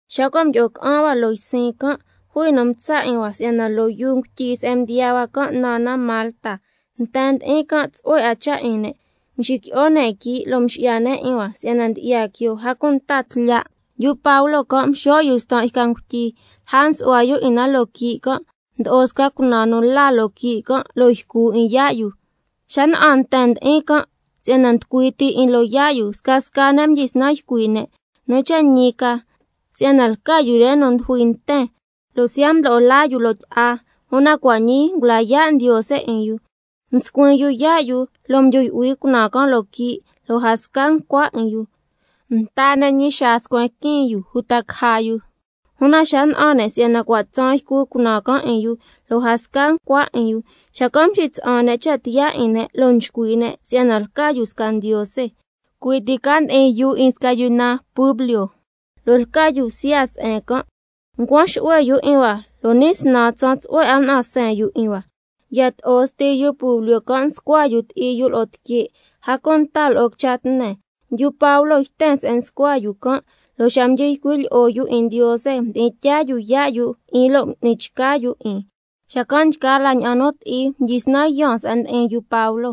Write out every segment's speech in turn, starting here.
Xa cua' mdyi'o ca'an hua loo ysin can', jui nu mtsa' 'in hua si'yana loo yuu ngutyi se'en mdiyaa hua can' naan na Malta. Nten ndi'in can' tsu'hue 'a cha' 'in ne', mxiqui'o ne' quii' lo' mxi'ya ne' 'in hua si'yana ndyi'ya quioo, a cunta tlya'. Yu Pablo can' mxo' yu stan' yca ngutyi, lja msu'hua yu 'in na loo quii' can', mdo'o snan sca cunaan nu la loo quii' can', lo' ycu 'in yaa' yu. Xa na'an nten nu ndi'in ca can', si'yana nducui ti 'in loo yaa' yu, scasca ne' mdyisnan ycui' ne': Nu cha' ñi ca si'yana lca yu re nu ndujui nten, lo' siya' mdo'o laa yu loo tyi'a, una cua' ñii ngula yaa' ndiose 'in yu. Mscuin yu yaa' yu, lo' mdyu yu'hui cunaan can' loo quii' lo' a sca ncua 'in yu. Nta ne' ñi xaa scuen quiin yu, uta caja yu, una xa na'an ne' si'yana cua' tsaan ycu cunaan can' 'in yu, lo' a sca ncua 'in yu, xacan' mxitsa'an ne' cha' tiyaa 'in ne', lo' nchcui' ne' si'yana lca yu sca ndiose. Cui' ti can' ndi'in yuu 'in sca yu naan Publio, lo' lca yu bsya se'en can', ncuan xu'hue yu 'in hua lo' ni' snan tsaan tsu'hue 'a mna'an seen yu 'in hua. Yato'o sti yu Publio can' nscua yu ti'i yu lo'o tique', a cunta lo'o quicha tne. Yu Pablo yten se'en nscua yu can', lo' xa mdyi ycui' lyi'o yu 'in Ndiose mdi'in tyaa yu yaa' yu 'in, lo' m'ni chca yu 'in. Xacan' nchgaa la ña'an nu ti'i ndi'in can' mdyisnan yaan se'en ndi'in yu Pablo,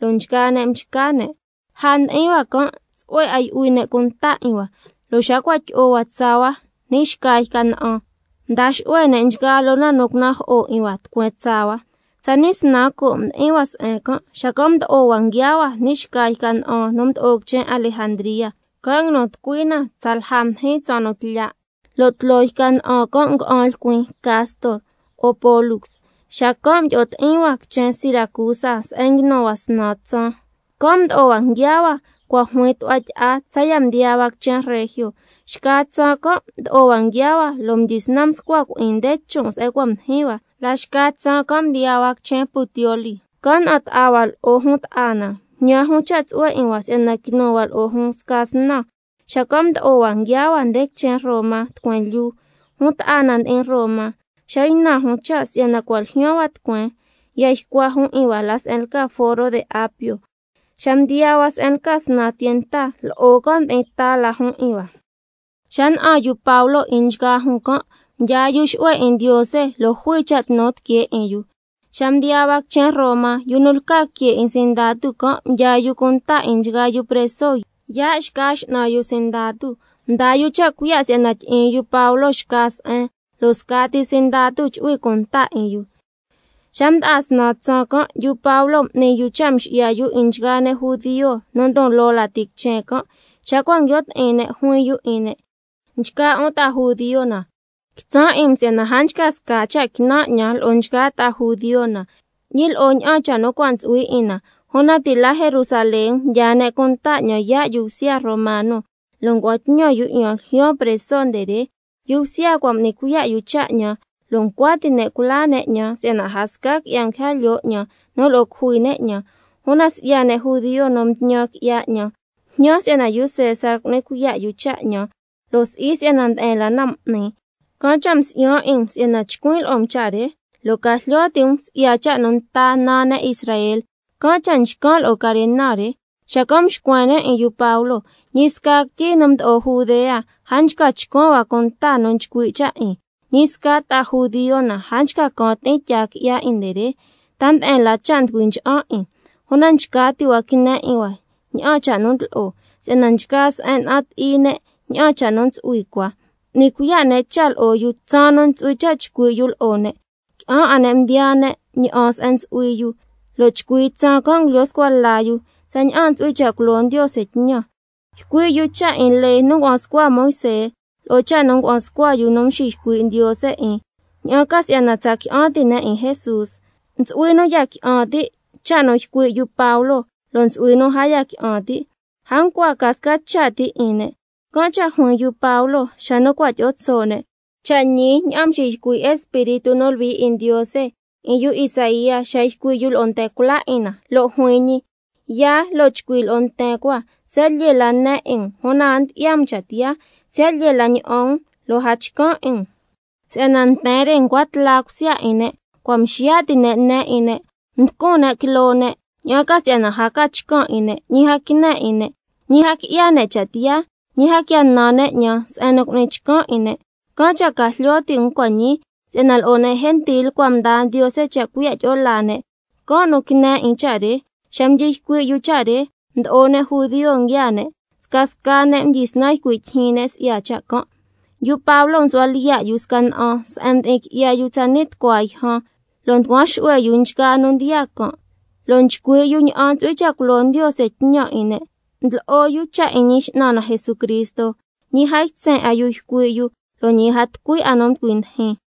lo' nchgaa ne' mchca ne'. Lja mdi'in hua can' tsu'hue 'a yu'hui ne' cunta 'in hua, lo' xa cua' tyi'o hua tsaa hua ni' xca yca na'an, xacan' mda xu'hue ne' nchgaa loo na nu cunajo'o 'in hua tucueen tsaa hua. Tsani' snan coo' mdi'in hua se'en can', xacan' mdo'o hua nguiaa hua ni' xca yca na'an nu mdo'o quichen Alejandría, can' nguinu tucui na tsalja mdijin tsaan nu tlya', lo' tloo na nga'an lcuin Castor lo'o Pólux. Xacan' mdyi'o ti'in hua quichen Siracusa se'en nguinu hua snan tsaan. Can' mdo'o hua nguiaa hua cua' juin tu'hua tyi'a tsaya' mdiyaa hua quichen Regio. Xca tsaan can' mdo'o hua nguiaa hua, lo' mdyisnan mscua cui'in nde chon' se'en cua' mdijin hua, la xca tsaan can' mdiyaa hua quichen Puteoli. Can' na'an ta'a hua lo'o jun ta'a na, mjñan jun cha' tsu'hue 'in hua si'yana quinu hua lo'o jun sca snan. Xacan' mdo'o hua nguiaa hua nde quichen Roma tucueen lyuu. Jun ta'a na ndi'in Roma, xa ynan jun cha' si'yana cua' ljyaan hua tucueen, ya ycua jun 'in hua la se'en lca Foro de Apio. Xa mdiyaa hua se'en lca Snan Tienta, lo'o can' ndi'in ta la jun 'in hua. Xa na'an yu Pablo 'in nchgaa jun can', mdyaa yu xu'hue 'in Ndiose lo' jui cha' tnu tiquee 'in yu. Xa mdiyaa hua quichen Roma, yu nu lca que 'in sindatu can' mdyaa yu cunta 'in nchgaa yu preso yaa' xca x'nan yu sindatu. Mdaa yu cha' cuiya' si'yana tyi'in yu Pablo xca se'en, lo' scati sindatu chu'hui cunta 'in yu. Xa mda'a snan tsaan can', yu Pablo m'ni yu cha' mxi'ya yu 'in nchgaa ne' judio nu ndon loo lati quichen can', xa cua' nguio' ti'in ne' juin yu 'in ne': Nchgaa 'un ta'a judio na, quitsan' 'in um si'yana a nchca sca cha' quinan' 'ñan lo'o nchgaa ta'a judio na, ñi lo'o ña'an cha' nu cua' ntsu'hui 'in na, una ti' la Jerusalén mdyaa ne' cunta 'ñan yaa' yu bsya romano, lo' ngua'an tñan yu 'ñan ljyaan preso nde re. Yu bsya cua' m'ni cuiya' yu cha' 'ñan, lo' ncua ti' ne' culaa ne' 'ñan si'yana a sca qui'ya nguija lyoo 'ñan nu lo'o cujui ne' 'ñan. Una si'ya ne' judio nu mtñan qui'ya 'ñan, mjñan si'yana yu César cu'ni cuiya' yu cha' 'ñan, lo' si'i si'yana nde'en la na m'nin. Can' cha' msi'yan 'in um si'yana chcuin' lo'o um cha' re, lo' ca jlyo ti' um si'ya cha' nu nta naa ne' Israel, can' cha' nchcan' lo'o carena re. Xacan' mxcuen ne' 'in yu Pablo: Ñi sca quityi nu mdo'o Judea, a nchca chcuan hua cunta nu nchcui' cha' 'in, ñi sca ta'a judio na, a nchca can ti'in tyaa qui'ya 'in nde re, ta nde'en la cha' nducui ncha'an 'in. Una nchca ti' hua quine 'in hua ña'an cha' nu ndlo'o, si'yana nchgaa se'en na'an ti'i ne' ña'an cha' nu ntsu'hui cua. M'ni cuiya' ne' cha' lo'o yu tsaan nu ntsu'hui cha' chcui' yu lo'o ne', qui'an 'a ne' mdiyaa ne' ña'an se'en ntsu'hui yu, lo' chcui tsaan can' ngulyo scua la yu tsaña'an ntsu'hui cha' culo Ndiose tñan, ycui' yu cha' 'in lee nu ngua'an scua Moisé, lo'o cha' nu ngua'an scua yu nu mxiycui' Ndiose 'in, ña'an ca si'yana tsa qui'an ti' ne' 'in Jesús. Ntsu'hui nu ya qui'an ti' cha' nu ycui' yu Pablo, lo' ntsu'hui nu a ya qui'an ti'. A ncua ca sca cha' ti 'in ne', can' cha' juin yu Pablo xa nu cua' tyi'o tso' ne': Cha' ñi ña'an mxiycui' Espíritu nu Luhui 'in Ndiose 'in yu Isaía xa ycui' yu lo'o nten cula 'in na, lo' juin ñi: —Yaa, lo' chcui' lo'o nten cua: Siya' lyee la ne 'in um, una a ndyi'ya um cha' tiyaa, siya' lyee la ña'an um lo' a chcan' 'in um. Si'yana nten re ncua tla cusya 'in ne', cua' mxiya' ti' ne' ne 'in ne', mducun ne' quiloo ne', ña'an ca si'yana a ca chcan' 'in ne', ñi a quine 'in ne', ñi a qui'ya ne' cha' tiyaa, ñi a quia nan ne' 'ñan se'en nu cu'nin chcan 'in ne'—. Can' cha' ca jlyo ti' um cua' ñii, si'yana lo'o ne' gentil cua' mdaa Ndiose cha' cuiya' tyi'o laa ne', can' nu quine 'in cha' re. Xa mdyi ycui' yu cha' re, mdo'o ne' judio nguiaa ne', scasca ne' mdyisnan ycui' tyijyin ne' si'ya cha' can'. Yu Pablo msu'hua lyiya' yu sca na'an se'en mdi'in qui'ya yu tsani' tucua yjan, lo' nducuan xu'hue yu nchgaa nu ndyi'an can', lo' nchcui' yu ña'an ntsu'hui cha' culo Ndiose tñan 'in ne', ndlo'o yu cha' 'in Ñi X'nan na Jesucristo, ñi a ytsen 'a yu ycui' yu lo' ñi a tucui 'a nu nducui ndijin.